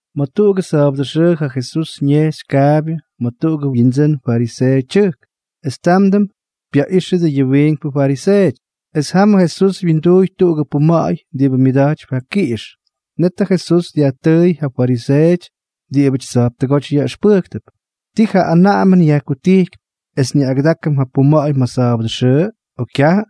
Ma̱ tuꞌugʉ sa̱a̱bʉdʉ xʉʉ ja Jesús ñejxy kaabyʉ ma̱ tuꞌugʉ windsʉ́n fariseeʉ tyʉjk, es támdʉm pyaꞌíxyʉty yʉ wiinkpʉ fariseeʉty. Es jam Jesús wyinduuy tuꞌugʉ puma̱ꞌa̱y diꞌibʉ myʉda̱jtypy ja kiꞌix. Net ja Jesús dyajtʉʉy ja fariseeʉty es diꞌibʉty tsa̱jptʉgóty yaꞌʉxpʉjktʉp: —¿Ti ja anaꞌamʉn yajkutijkypy, es nyaꞌꞌagʉdákʉm ja puma̱ꞌa̱y ma̱ sa̱a̱bʉdʉ xʉʉ, o kyajʉ?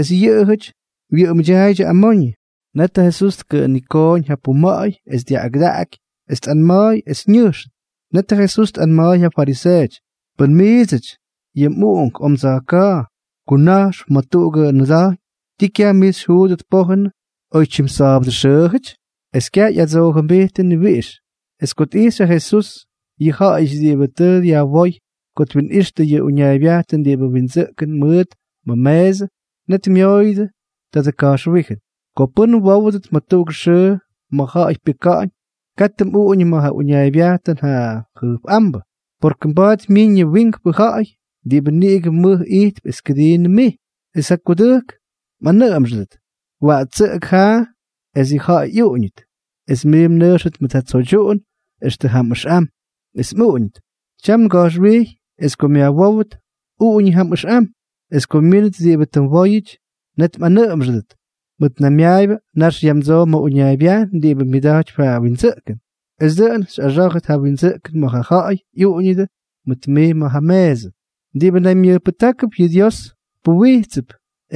Es yʉꞌʉjʉty wyʉꞌʉmda̱a̱ydyʉ amoñʉ. Net ja Jesús tkʉꞌʉnitooñ ja puma̱ꞌa̱y es dyaꞌꞌagʉdaky, es tꞌanma̱a̱y es ñʉjxʉt. Net ja Jesús tꞌanma̱a̱y ja fariseeʉty: —Pʉn miidsʉty yʉ mꞌuꞌunk o mdsa̱jka̱a̱ kuna̱jxp ma̱ tuꞌugʉ nʉda̱jñ, ¿ti kyaj mij xyjuudʉt pójʉnʉ, oy jyatimsa̱a̱bʉxʉʉjʉty? Es kyaj ꞌyadsoojʉmbijttʉ ni wiꞌix. Es ko tꞌijxy ja Jesús yʉ ja̱ꞌa̱yʉty diꞌibʉ tʉ yajwóy ko twinꞌixtʉ yʉ uñaaybyajn diꞌibʉ windsʉꞌkʉn mʉʉt ma̱ meesʉ, net myooyʉdʉ tadʉ ka̱jxwíjʉn: —Ko pʉ́n mwówʉdʉt ma̱ tuꞌugʉ xʉʉ ma̱ ja̱ꞌa̱y pyʉka̱ꞌa̱ñ, katʉ mꞌuꞌuñʉ ma̱ ja uñaaybyajn ja jʉjpꞌámbʉ. Mba̱a̱t myiñʉ wiinkpʉ ja̱ꞌa̱y diꞌibʉ niꞌigʉ mʉj ijtp es kʉdii mij, es ja kudʉjk mꞌanʉʉmʉdʉt: “Waꞌtsʉꞌʉk jaa es yʉ ja̱ꞌa̱y ꞌyuꞌuñʉt.” Es mij mnʉjxʉt mʉt ja tsoydyuꞌun extʉ jam ʉxꞌam, es mꞌuꞌuñʉt. Tyam nga̱jxwijy es ko myajwówʉt, uꞌuñʉ jam ʉxꞌam. Es ko myínʉt diꞌibʉ tʉ mwóyʉty, net mꞌanʉʉmʉdʉt: “Mʉtnaymyaayʉbʉ, nax yamdsoo ma̱ uñaaybyajn diꞌibʉ myʉda̱jtypy ja windsʉꞌkʉn.” Es dʉꞌʉn xyꞌaxá̱jʉt ja windsʉꞌkʉn ma̱ ja ja̱ꞌa̱y ꞌyuꞌuñʉdʉ mʉt mij ma̱ ja meesʉ. Diꞌibʉ naymyʉjpʉjtákʉp, yʉꞌʉ Dios puwijtsʉp;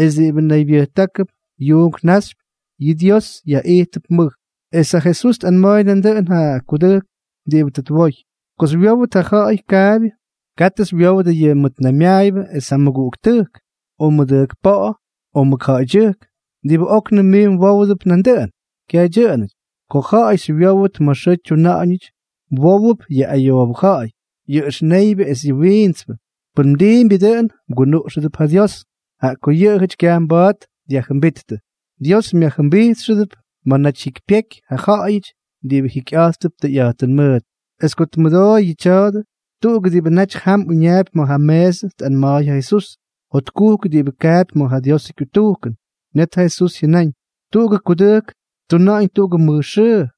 es diꞌibʉ naybyʉjtákʉp yuunk naxypyʉ, yʉꞌʉ Dios yaꞌítʉp mʉj. Es ja Jesús tꞌanma̱a̱y nandʉꞌʉn ja kudʉjk diꞌibʉ tʉ twoy: —Ko xywyówʉt ja ja̱ꞌa̱y kaabyʉ, katʉ xywyowdʉ yʉ mmʉtnaymyaayʉbʉ es ja mmʉguꞌuktʉjk, o mmʉdʉjkpa̱ꞌa̱, o mʉkja̱ꞌa̱ydyʉjk, diꞌibʉ óknʉm mij mwówʉdʉp nandʉꞌʉn. Kyaj dyʉꞌʉnʉty. Ko ja̱ꞌa̱y xywyówʉt ma̱ xʉʉ xytyuna̱ꞌa̱ñʉty, mwówʉp yʉ ayoobʉ ja̱ꞌa̱y, yʉ ʉxneybyʉ es yʉ wiintspʉ. Pʉn mdiimbyʉ dʉꞌʉn, mgunuꞌxʉdʉp ja Dios, jaꞌa ko yʉꞌʉjʉty kyaj mba̱a̱t dyajjʉmbíttʉ. Dios myajjʉmbijtxʉdʉp ma̱ naty jyikypyeky ja ja̱ꞌa̱yʉty diꞌibʉ jikyꞌa̱jttʉp tʉyꞌa̱jtʉn mʉʉt. Es ko tmʉdooy yʉ tya̱a̱dʉ, tuꞌugʉ diꞌibʉ naty jam uñaapy ma̱ ja meesʉ tꞌanma̱a̱y ja Jesús: —¡Jotkujk diꞌibʉ kaapy ma̱ ja Diosʉ kyutujkʉn! Net ja Jesús jyʉnáñ: —Tuꞌugʉ kudʉjk ttuna̱ꞌa̱ñ tuꞌugʉ mʉj xʉʉ.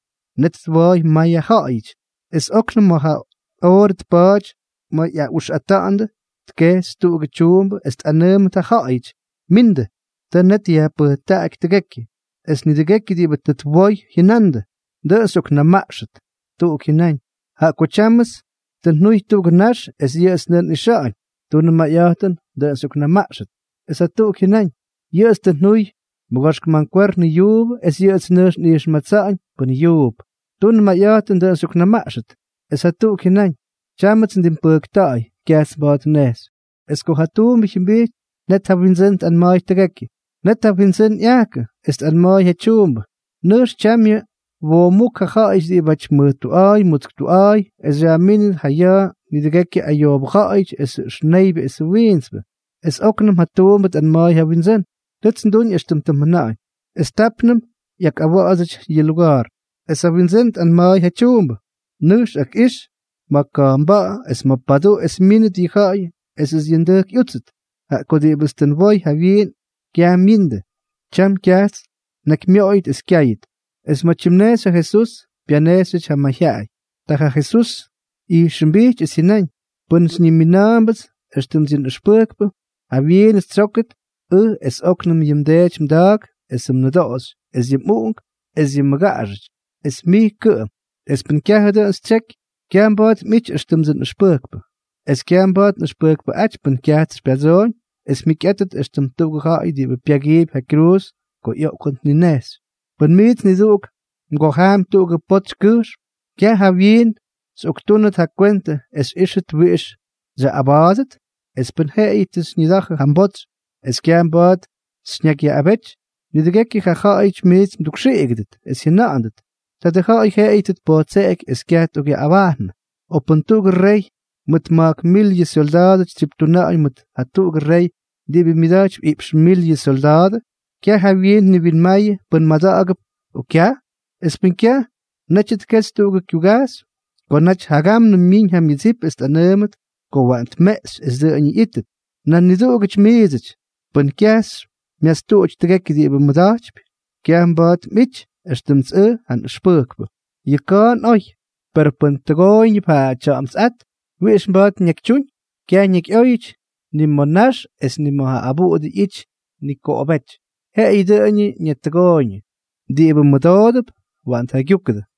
Net twooy may ja ja̱ꞌa̱yʉty. Es óknʉm ma̱ ja oorʉ tpaty ma̱ ꞌyaꞌuxꞌata̱ꞌa̱ndʉ, tkejxy tuꞌugʉ tyuumbʉ es tꞌanʉʉmʉt ja ja̱ꞌa̱yʉty: “Mindʉ. Tʉ net yajpʉjtakta̱ꞌa̱y tʉgekyʉ.” Es nidʉgekyʉ diꞌibʉ tʉ twoy jyʉnandʉ: “Dʉꞌʉn xyꞌoknamaꞌxʉt.” Tuꞌuk jyʉnáñ: “Jaꞌa ko tyámʉts tʉ njuy tuꞌugʉ nax, es yʉꞌʉts nʉjx nꞌixa̱ꞌa̱ñ. Tunʉ mayꞌa̱jtʉn, dʉꞌʉn xyꞌoknamaꞌxʉt.” Es jatuꞌuk jyʉnáñ: “Yʉꞌʉts tʉ njuy mʉgoxk mankwernʉ yuubʉ, es yʉꞌʉts nʉjx nꞌijxmatsa̱ꞌa̱ñ pʉ́n yuup. Tun mayꞌa̱jtʉn, dʉꞌʉn xyꞌoknamaꞌxʉt.” Es jatuꞌuk jyʉnáñ: “Tyámʉts ndimpʉjkta̱ꞌa̱y. Kyajts mba̱a̱t nnejxy.” Es ko ja tuumbʉ jyʉmbijty, net ja wyindsʉ́n tꞌanma̱a̱y tʉgekyʉ. Net ja wyindsʉ́n ꞌyajkʉ, es tꞌanma̱a̱y ja tyuumbʉ: “Nʉjx tyamyʉ woomúk yʉ ja̱ꞌa̱yʉty diꞌibáty mʉj tuꞌa̱a̱y mutsk tuꞌa̱a̱y, es xyajmínʉt ja ya̱a̱ nidʉgekyʉ ayoobʉ ja̱ꞌa̱yʉty esʉ ʉxneybyʉ esʉ wiintspʉ.” Es óknʉm ja tuumbʉ tꞌanma̱a̱y ja wyindsʉ́n: “Tʉts nduñ éxtʉm tʉ mjʉna̱ꞌa̱ñ, es tápnʉm ꞌyakꞌawa̱ꞌa̱dsʉty yʉ luga̱a̱r.” Es ja wyindsʉ́n tꞌanma̱a̱y ja tyuumbʉ: “Nʉjx, akꞌix ma̱ ka̱jpnba̱ꞌa̱ es ma̱ paduꞌu, es myíndʉt yʉ ja̱ꞌa̱y esʉts yʉ ndʉjk ꞌyútsʉt. Jaꞌa ko diꞌibʉts tʉ njawoy jawyiin es kyaj myindʉ, tyam kyajts nnakymyoꞌoyʉt es kyáyʉt.” Es ma̱ tyimnejxy ja Jesús, pyanejxyʉty ja mayjyaꞌay. Ta ja Jesús ꞌyijxʉmbijty es jyʉnáñ: —Pʉn xyñimina̱a̱mbʉts éxtʉmts yʉ nꞌʉxpʉjkpʉ, jawyiinʉts xytsyókʉt ʉj es óknʉm yʉ mdeety mda̱a̱k esʉ mnʉdoꞌoxy es yʉ mꞌuꞌunk es yʉ mmʉgaꞌaxʉty, es mij kʉꞌʉm. Es pʉn kyajʉ dʉꞌʉn xytsyeky, kyaj mba̱a̱t mꞌity éxtʉmdsʉ nꞌʉxpʉjkpʉ. Es kyaj mba̱a̱t nꞌʉxpʉjkpʉꞌáty pʉn kyajts xypyadsooñ es mjikyꞌátʉt éxtʉm tuꞌugʉ ja̱ꞌa̱y diꞌibʉ pyagiipy ja kyruuz ko ꞌyoꞌkʉn tninejxy. ’Pʉn miits niduꞌuk mgojaampy tuꞌugʉ potsy kʉjxm, ¿kyaj jawyiin xyꞌoktúnʉt ja mgwentʉ es xyꞌíxʉt wiꞌix xyaꞌꞌaba̱a̱dʉt? Es pʉn jeꞌeyʉ tʉ xyñida̱jʉ ja mbotsy es kyaj mba̱a̱t xyñakyyaꞌꞌabety, nidʉgekyʉ ja̱ꞌa̱yʉty mij mdukxiꞌigʉdʉt es jyʉna̱ꞌa̱ndʉt: “Tadʉ ja̱ꞌa̱y jeꞌeyʉ tʉ tpojtseꞌegyʉ es kyaj tꞌokꞌyaꞌꞌabajnʉ.” ’O pʉn tuꞌugʉ rey mʉt ma̱jk mil yʉ syolda̱a̱dʉ tsyiptuna̱ꞌa̱ñ mʉt jatuꞌugʉ rey diꞌibʉ myʉda̱jtypy iꞌpx mil yʉ syolda̱a̱dʉ, ¿kyaj jawyiin tniwinmayʉ pʉn mada̱ꞌa̱gʉp o kyaj? Es pʉn kyaj, netyʉ tkexy tuꞌugʉ kyugajxy ko naty jagámnʉm myiñ ja myʉdsip es tꞌanʉʉmʉt ko waꞌan tmeꞌxy es dʉꞌʉñʉ ꞌyítʉt. ’Nan niduꞌugʉty miidsʉty, pʉn kyaj xymyastuꞌuty tʉgekyʉ diꞌibʉ mmʉda̱jtypy, kyaj mba̱a̱t mꞌity éxtʉmts ʉj ja nꞌʉxpʉjkpʉ. ’Yʉ ka̱a̱n oy. Per pʉn tʉgooyñʉp ja tya̱ꞌa̱mtsꞌát, ¿wiꞌix mba̱a̱t ñakytyúñ? Kyaj ñakyꞌóyʉty, ni ma̱ nax es ni ma̱ ja abuꞌudʉ ꞌyity nikoꞌobéty. Jeꞌeyʉ dʉꞌʉñʉ ñatʉgooyñʉ. Diꞌibʉ mʉdoodʉp, waꞌan tjaygyúkʉdʉ.